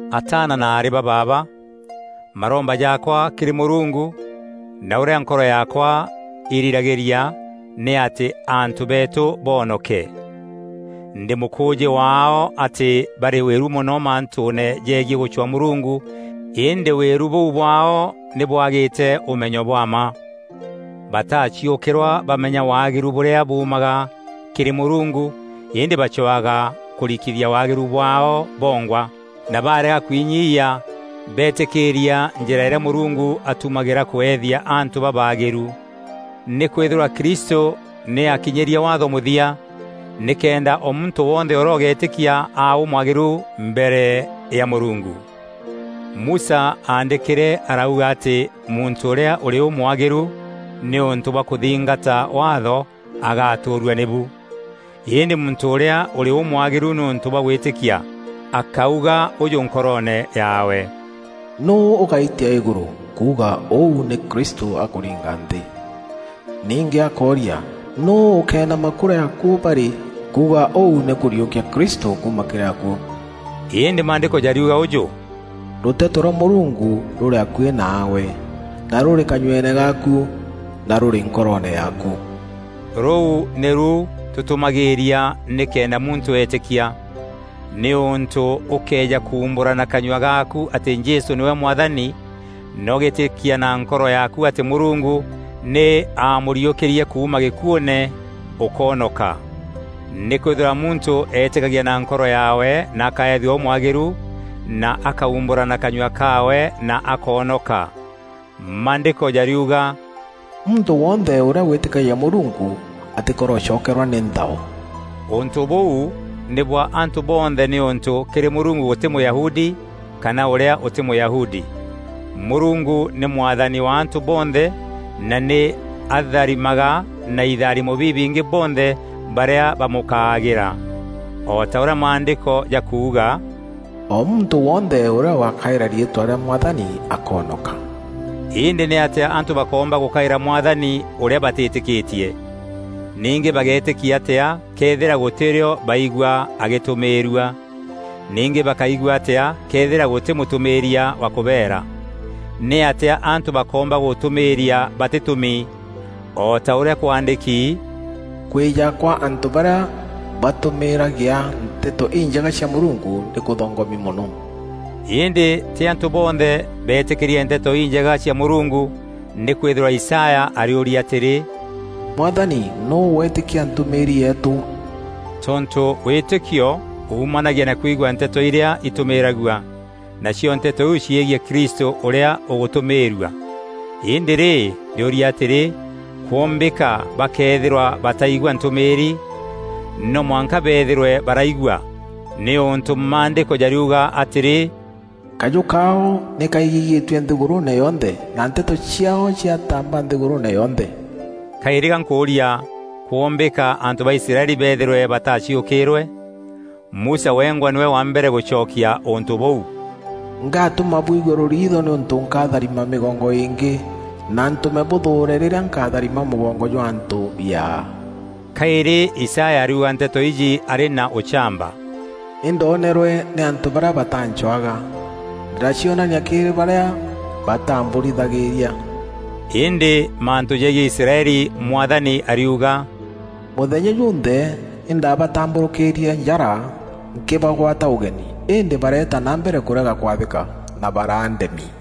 Ataana na aarî ba baaba, maromba jaakwa kîrî Mûrungu, na ûrîa nkoro yaakwa irîragîria, nî atî antû beetû boonoke. Ndî mûkûûjî waao atî barî wîru mono mantûûne jegiî gûcwaa Mûrungu îndî wîru bûu bwaao nî bwagîte ûmenyo bwa mma. Bataaciûkîrwa bamenya waagîru bûrîa buumaga kîrî Mûrungu îndî bacwaga kûrikithia waagîru bwaao bongwa; na barega kwinyia beetîkîîria njîra îrîa Mûrungu atumagîra kweethia antû babaagîru. Nîkwîthîrwa Kristû nî aakinyîrie Waatho mûthia, nîkenda o muntû wonthe ûrîa ûgeetîkia aa ûmwagîrû mbere ya Mûrungu. Musa aandîkîre arauga atî muntû ûrîa ûrî ûmwagîru nîûntû bwa kûthingata Waatho agatûûrua nîbu. Îndî muntû ûrîa ûrî ûmwagîru nîûntû bwa gwîtîkia, akáuga ûjû nkoroone yaawe, “Nûû ûgaitia îgûrû?” (Kuuga ûu nî Kristû akûringa nthî). Ningî akória, “Nûû ûkenama kûrîa akuû barî?” (Kuuga ûu nî kûriûkia Kristû kuuma kîrî akuû). Îndî Maandîko jariuga ûjû, “Rûteto rwa Mûrungu rûrî akuî naagwe, na rûrî kanyueene gaaku, na rûrî nkoroone yaaku.” Rûu nîru tûtûmagîîria nîkenda muntû eetîkia; nîûntû ûkëeja kuumbûra na kanyua gaaku atî Jesû nîwe Mwathani, na ûgeetîkia na nkoro yaaku atî Mûrungu nî aamûriûkîrie kuuma gîkuûne, ûkoonoka. Nîkwîthîrwa muntû eetîkagia na nkoro yaawe na akaethua ûmwagîru na akaumbûra na kanyua kaawe na akoonoka. Maandîko jariuga, “Muntû wonthe ûrîa wîtîkagia Mûrungu, atîkorocokerwa nî nthao.” Ûntû bûu nî bwa antû bonthe nîûntû kîrî Mûrungu gûtî Mûyahudi kana ûrîa ûtî Mûyahudi. Mûrungu nî Mwathani wa antû bonthe na nî atharimaga na itharimo bibingî bonthe barîa bamûkaagaîra. O ta ûrîa Maandîko jakuuga, “O muntû wonthe ûrîa ûgakaîra riîtwa rîa Mwathani akoonoka.” Îndî nîatîa antû bakoomba gûkaîra Mwathani ûrîa batîtîkîtie? Ningî bageetîkia atîa këethîra gûtî rîo baigua agîtûmîîrua? Ningî bakaigua atîa këethîra gûtî mûtûmîîria wa kûbeera? Nîatîa antû bakoomba gûtûmîîria batîtûmi? O ta ûrîa kwaandîki, “Kwîja kwa antû barîa batûmîîragia Nteto Injega cia Mûrungu nî kûthongomi mono!” Îndî tî antû bonthe beetîkîrie Nteto Injega cia Mûrungu; nîkwîthîrwa Isaya ariûria atîrî, “Mwathani nûû weetîkia ntûmîîri yeetû?” Tontû wîtîkio buumanagia na kwigua nteto îrîa itûmîragua, nacio nteto iu ciegiî Krîstû ûrîa ûgûtûmîîrua. Îndî rî, ndiûria atîrî, “kwombîka bakeethîrwa bataigua ntûmîîri?” No mwanka beethîrwe baraigua; nîûntû Maandîko jariuga atîrî, “Kajû kaao nî kaigîgîtue nthîgûrûûne yonthe, na nteto ciaao ciatamba nthîgûrûûne yonthe.” Kaîrî ga nkûûria, kûûmbîka antû ba Israeli beethîrwe bataaciûkîîrwe? Musa wengwa nîwe wa mbere gûcokia ûntû bûu: “Ngatûma bwiigue rûriitho nîûntû nkatharima mîgongo îngî, na ntûme bûthûûre rîrîa nkatharima mûgongo jwa antû biaa.” Kaîrî Isaya ariuga nteto iji arî na ûchamba, “Nî ndonerwe nî antû barîa bataancwaga, ndîracionania kîrî barîa bataambûrithagîria.” Îndî mantû jegiî Israeli Mwathani ariuga: “Mûthenya junthe nî ndaabatambûrûkîîrie njara nkîbagwata ûgeni îndî bareeta na mbere kûrega kwathîka na baraa ndemi.”